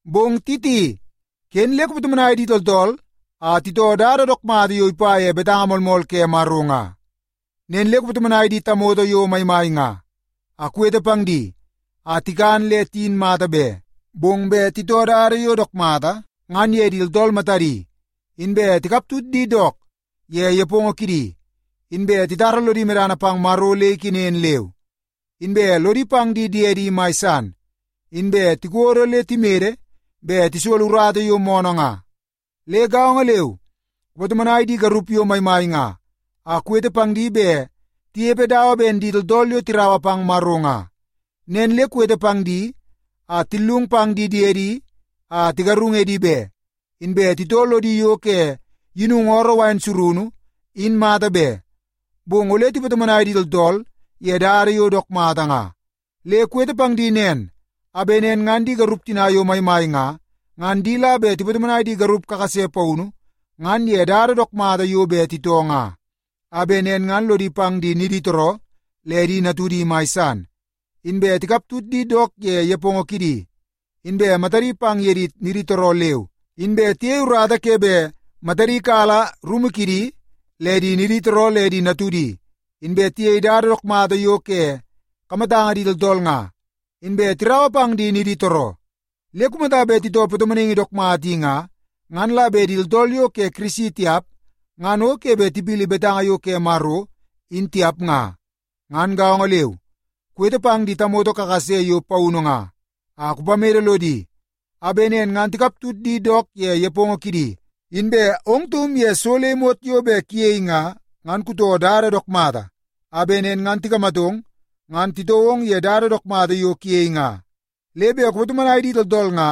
Bong Titi, ken le kupatomonai di tooltool a titoo dada dook mata yo ipa ye betanga moolmool ke Maro nga. Nen le kupatomonai di tamoto yo maimai nga, a kuwete pang di a tikan le tiyin mata be, bong bet titoo dada yo dook mata ngan ye di tooltool matadi, inbe tikaptut di dook ye nepongo kidi, inbe titara lodi medana pang Maro le ikenen leu, inbe lodi pang di diedi mai san, inbe tikodo le timede bet tisolo urata yo moonoo nga. Le gaongo leu, kupatomonai di garup yo maimai nga, a kuwete pang di bet tinepe dawa ben di tooltool yo tiraua pang Maro nga. Nen le kuwete pang di a tillung pang di diedi a tigarung edi be, inbe titoo lodi yo ke yinungu ooroo wain surunu in mata be, bong ole tipatomonai di tooltool ye dada yo dook mata nga. Le kuwete pang di nen a bet nen ngan di garup tina yo maimai nga, ngan di la bet tipatomonai di garup kakase paunu ngan ye dada dook mata yo bet titoo nga. A bet nen ngan lodi pang di niditooroo le di natudi mai san, inbe tikaptut di dook ye nepongo kidi, inbe matadi pang ye di niditooroo leu, inbe tiyei urata ke bet matadi kala rumu kidi le di niditooroo le di natudi, inbe tiyei dada dook mata yo ke kamatanga di tooltool nga, inbe tiraua pang di niditooroo. Le kumata bet titoo patomonaingi dook mata i nga, ngan la bet di tooltool yo ke Kirisi tiap, ngan o ke bet tipili betanga yo ke Maro in tiap nga. Ngan gaongo leu, kuwete pang di tamoto kakase yo paunu nga, a kupamede lodi a bet nen ngan tikaptut di dook ye nepongo kidi. Inbe ong taum ye so le imot yo bet kuyei nga, ngan kutoo dada dook mata a bet nen ngan tikamatong ngan titoo ong ye dada dook mata yo kuyei nga. Le bet kupatomonai di tooltool nga,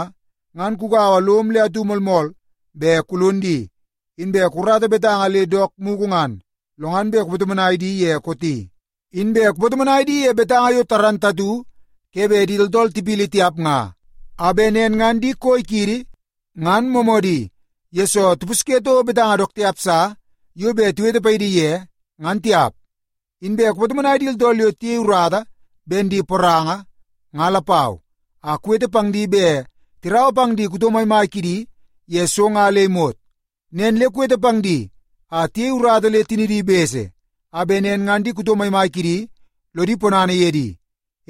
ngan kugaua lom le atu moolmool bet kulon di, inbe kukarata betanga le dook mugu ngan, lo ngan bet kupatomonai di ye kooti. Inbe kupatomonai di ye betanga yo moolmool ke bet di tooltool tipili tiap nga, a bet nen ngan di koi kiidi, ngan moomoodi, yesoo tipusye toko betanga dook tiap sa yo bet tiwete paidi ye ngan tiap. Inbe kupatomonai di tooltool yo tiyei urata ben di poranga nga lapau, a kuwete pang di bet tiraua pang di kuto maimai kidi ye so nga le imot. Nen le kuwete pang di a tiyei urata le tinidi bese, a bet nen ngan di kuto maimai kidi lodi ponana ye di.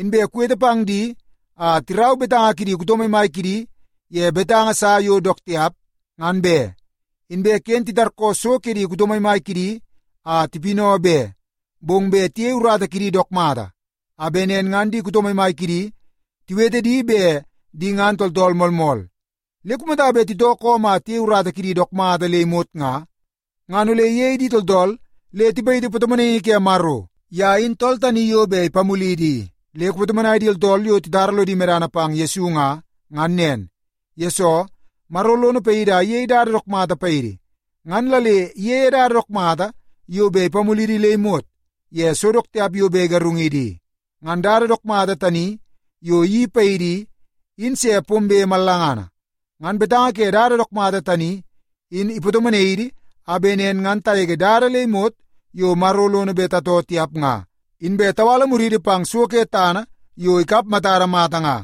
Inbe kuwete pang di a tirau betanga kidi kuto maimai kidi ye betanga sa yo dook tiap ngan be, inbe ken titarkoo so ke di kuto maimai kidi a tipinau be, bong bet tiyei urata kidi dook mata a bet nen ngan di kuto maimai kidi tiwete di bet di ngan tooltool moolmool. Le kumata bet titoo koom a tiyei urata kidi dook mata le imot nga, ngan ole iyei di tooltool le tipayiti patomonaingi ke Maro. Ye in tool tani yo bet ipamulidi i. Le kupatomonai di tooltool yo titara lodi medana pang Yesu nga, ngan nen, yesoo Maro lono paidi a iyei dada dook mata paidi. Ngan la le iyeie dada dook mata yo bet ipamulidi le imot ye so dook tiap yo bet igarungidi i. Ngan dada dook mata tani yo iyeii paidi i, in se pombe mallangana. Ngan betanga ke dada dook mata tani, in ipatomonai idi a bet nen ngan tagege dada le imot yo Maro lono bet tatoo tiap nga, inbe tawala muridi pang so ke tana yo ikap matada mata nga.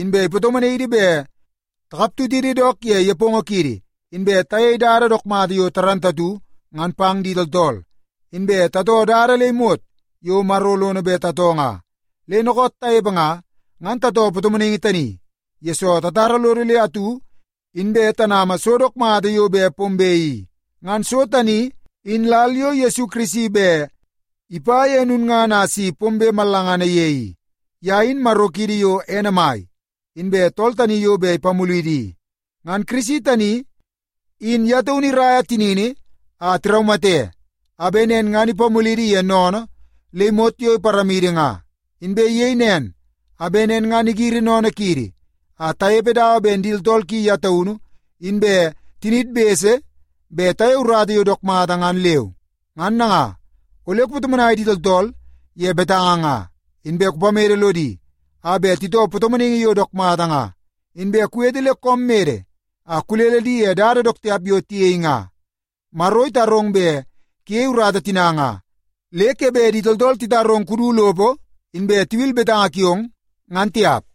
Inbe ipatomonai idi bet takaptutidi dook ye nepongo kiidi, inbe tayei dada yo dook mata ngan pang di tooltool, inbe tatoo dada le imot yo Maro lono bet tatoo nga. Le dookoot tanepe nga, ngan tatoo patomonaingi tani, yesoo tatara lodo le atu inbe tanama so dook mata yo bet pombe i. Ngan so tani in lal yo Yesu Kirisi bet ipa ye lulngana a si pombe mallangana ye i. Ye in Maro kiidi yo ene mai, inbe tool tani yo bet ipamulidi i. Ngan Kirisi tani in ye taunu iraia tinini a tiraumate a bet nen ngan ipamulidi ye sennene le imot yo iparamidi nga. Inbe iyei nen a bet nen ngan igiri sennene kiidi a tanepe dawa ben di tooltool ki ye taunu inbe tiniid bese bet tayei urata yo dook mata ngan leu. Ngan nanga, ole kupatomonai di tooltool ye betanga nga. Inbe kupamede lodi a bet titoo patomonaingi yo dook mata nga, inbe kuwete le koom mede a kulele di ye dada dook tiap yo tiyei nga. Maro itarong bet kuyei urata tina nga, le ke bet di tooltool titarong kudu lopo inbe tiwil betanga kiong, ngan tiap.